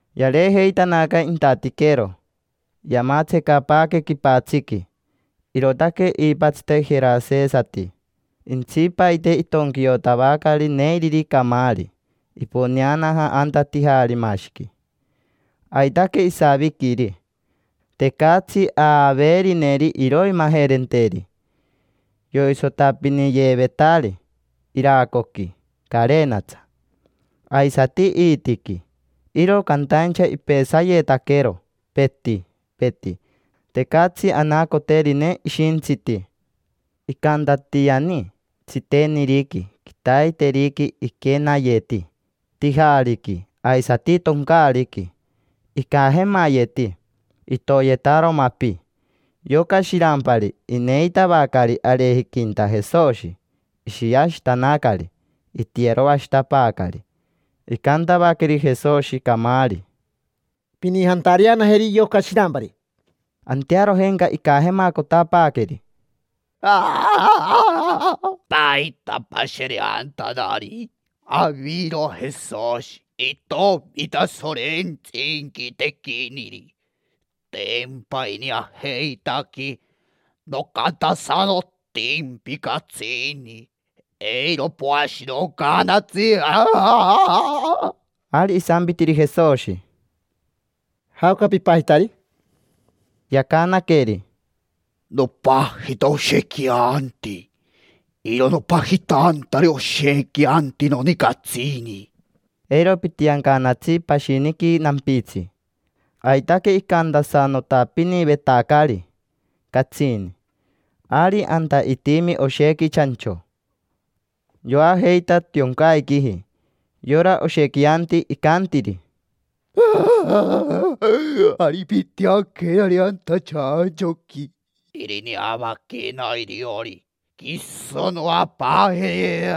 Yareejeitanaca intatiquero, yamatsecapaaque quipatsiqui: irootaque iipatsite jerasesati. Intsipaite itonquiotavacari neiriri camaari, iponeanaja anta tijaarimashiqui, aitaque isaviquiri. Tecatsi aaveerineri iroimajerenteri. Yoisotapiniyeevetari iracoqui carenatsa, aisati iitiqui, iro cantaincha ipesayetaquero, peti, peti. Tecatsi anacoterine ishintsiti. Icantatiani: tsiteniriqui, quitaiteriqui, iquenayeti tijaariqui aisati toncaariqui. Icajemayeti, itoyetaro mapi. Yoca shirampari ineitavacari arejiquinta Jesoshi, ishiashitanacari, itiyeroashitapaacari. Icantavaqueri Jesoshi camaari: —Pinijantareanajeri yoca shirampari. Antearojenca icajemacotapaaqueri: —¿Paita pashereantanari? Aviro Jesoshi, itomi Tasorentsi inquitequiniri, tempa ineajeitaquee. Nocantasanotimpi catsini, eiro poashinoncaanatsi. Ari isampitiri Jesoshi: —¿Jaoca pipajitari? Yacanaqueri: —Nopajita Oshequianti. Iro nopajitantari, oshiquianti noni catsini. Eiro pitiancanatsi pashiniqui nampitsi. Aitaque icantasanotapinivetacari catsini. Ari anta itimi oshequi chancho, yoajeita tioncaiquiji. Yora Oshequianti icantiri: —Ari pintianquenari anta chanchoqui, irineavaquena iriori, quiso noapaajeri.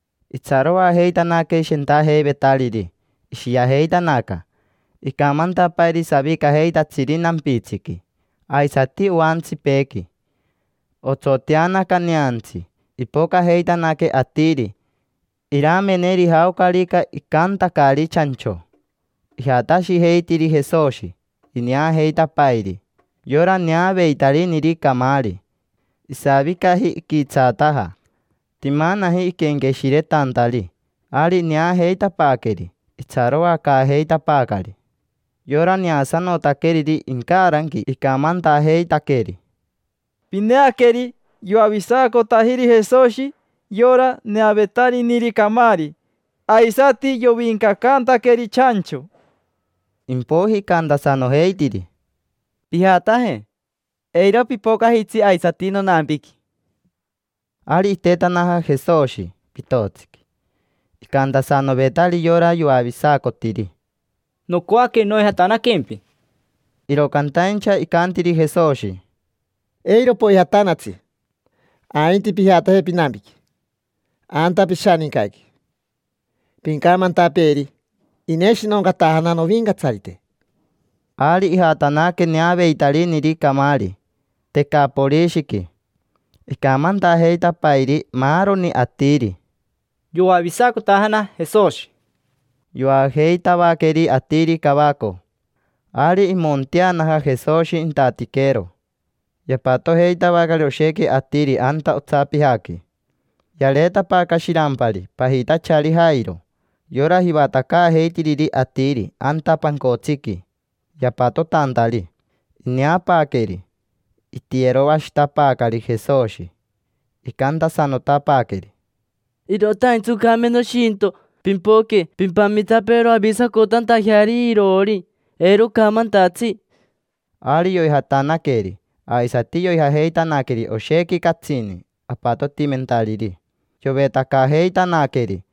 Itsaroajeitanaque shentajeivetariri, ishiajeitanaca, icamantapairi savicajeitatsiri nampitsiqui, aisati oantsipeequi. Otsoteanaca neantsi. Ipocajeitanaque atiri irameneri jaocarica icantacari chancho. Ijatashijeitiri Jesoshi, ineajeitapairi yora neaveitariniri camaari. Isavicaji, iquitsaataja, timanaji iquenqueshiretantari. Ari ineajeitapaaqueri, itsaroacaajeitapaacari. Yora neasanotaqueriri incaranqui icamantajeitaqueri: —Pineaqueri, yoavisacotajiri Jesoshi yora neaveitariniri camaari. Aisati yoviincacantaqueri chancho. Impoiji icantasanojeitiri: —Pijataje, eiro pipocajitsi aisati nonampiqui. Ari itetanaja Jesoshi pitotsiqui. Icantasanovetari yora yoavisacotiri: —Nocoaque noijatanaquempi. Iro cantaincha, icantiri Jesoshi: —Eiro poijatanatsi, ainti pijataje pinampiqui, anta pishanincaqui. Pincamantapeeri: “Ineshinoncatajana novincatsarite”. Ari ijatanaque neaveitariniri camaari Tecaporishiqui. Icamantajeitapairi maaroni atiri: —Yoavisacotajana Jesoshi. Yoajeitavaqueri atiri cavaco. Ari imonteanaja Jesoshi intatiquero. Yapatojeitavacari oshequi atiri anta otsapijaqui. Yareetapaaca shirampari pajitachari Jairo, yora jivatacaajeitiriri atiri anta pancotsiqui yapatotantari. Ineapaaqueri, itiyeroashitapaacari Jesoshi. Icantasanotapaaqueri: —Irotaintsi oncame noshinto. Pimpoque pimpamitapeero avisacotantajeari iroori, eiro ocamantatsi. Ari yoijatanaqueri, aisati yoijajeitanaqueri oshequi catsini apatotimentariri, yovetacajeitanaqueri.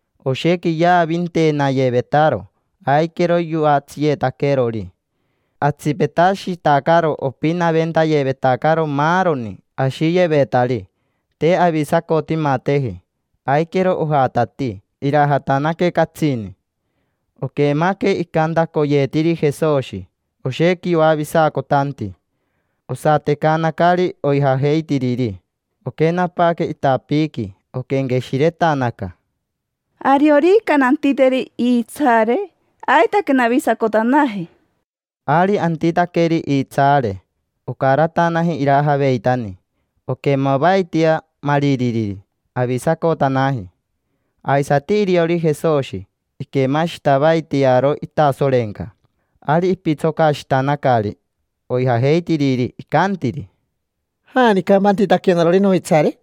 Oshequi yaavinteenayevetaro, aiquero yoatsiyeetaquerori. Atsipetashitacaro opinaventayevetacaro maaroni ashiyevetari. Te avisacotimateji, aiquero ojatatii irajatanaque catsini. Oquemaque icantacoyeetiriri Jesoshi: “Oshequi yoavisacotanti”. Osatecanacari oijajeitiriri, oquenapaaque itapiiqui. Oquenqueshiretanaca: —Ariorica nantiteri iitsaare, aitaque navisacotanaje. Ari antitaqueri iitsaare, ocaratanaji irajaveitani. Oquemavaitia maaririri, avisacotanaji. Aisati iriori Jesoshi, iquemashitavaitiaro itasorenca. Ari ipitsocashitanacari oijajeitiriri, icantiri: —¿Janicampa antitaquenarori noitsaare?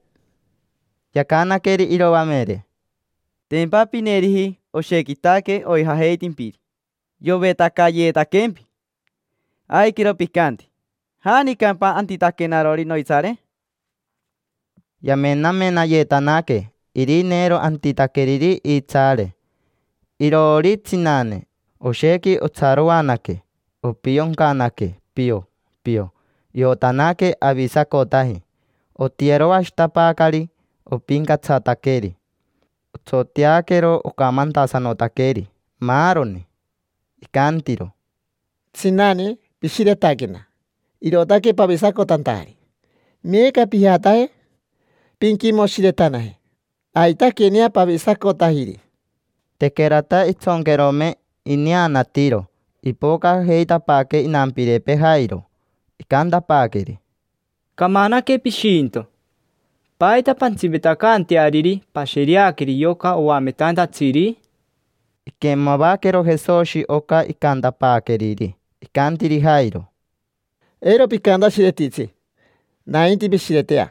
Yacanaqueri iroamere: —Tempa pineeriji yoshequitaque oijajeitimpiri. Yovetacayetaquempi. Aiquero picanti: “¿Janicampa antitaquenarori noitsaare?” Yamenamenayetanaque irineero antitaqueriri iitsaare. Iroori tsinane, oshequi otsaroanaque, opioncanaque, pio, pio. Iotanaque avisacotaji. Otiyeroashitapaacari, opincatsataqueri. Otsoteaquero ocamantasanotaqueri maaroni. Icantiro: —Tsinane, pishiretaquena, irootaque pavisacotantajari. Meeca pijataje, pinquimoshiretanaje. Aitaquenea pavisacotajiri. Tequerata intsonquerome ineanatiro, ipocajeitapaaque inampirepee Jairo. Icantapaaqueri: —Camanaque pishinto. ¿Paita pantsipetacanteariri pashereaqueri yoca oametantatsiri? Iquemavaquero Jesoshi oca icantapaaqueriri. Icantiri Jairo: —Eiro picantashiretitsi, nainti pishiretea.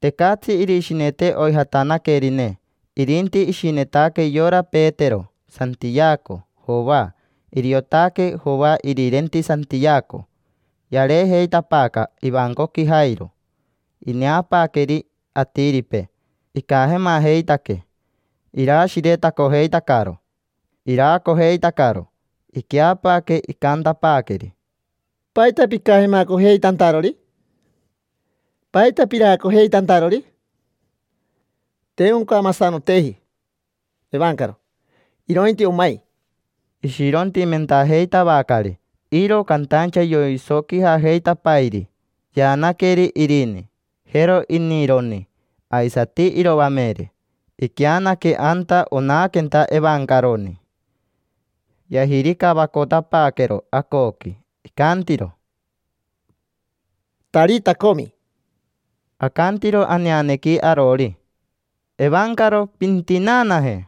Tecatsi irishinete oijatanaquerine. Irinti ishinetaque yora Petero, Santiaco, Joa. Iriotaque Joa irirenti Santiaco. Yareejeitapaaca ivancoqui Jairo. Ineapaaqueri atiripee: icajemajeitaque, iraashiretacojeitacaro, iraacojeitacaro. Iqueapaaque, icantapaaqueri: —¿Paita picajemacojeitantarori? ¿Paita piraacojeitantarori? Te oncamasanoteji evancaro, irointi omai. Ishirontimentajeitavacari, iro cantaincha yoisoquijajeitapairi. Yaanaqueri irini, jero inironi, aisati iroamere, iqueanaque anta onaquenta evancaroni. Yajiricavacotapaaquero acoqui. Icantiro: —Tarita comi. Acantiro aneanequi arori: “Evancaro, pintinaanaje”.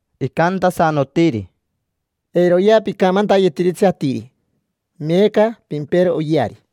Icantasanotiri: —Eiroya picamantayetiritsi atiri. Meeca pimpero oyeari.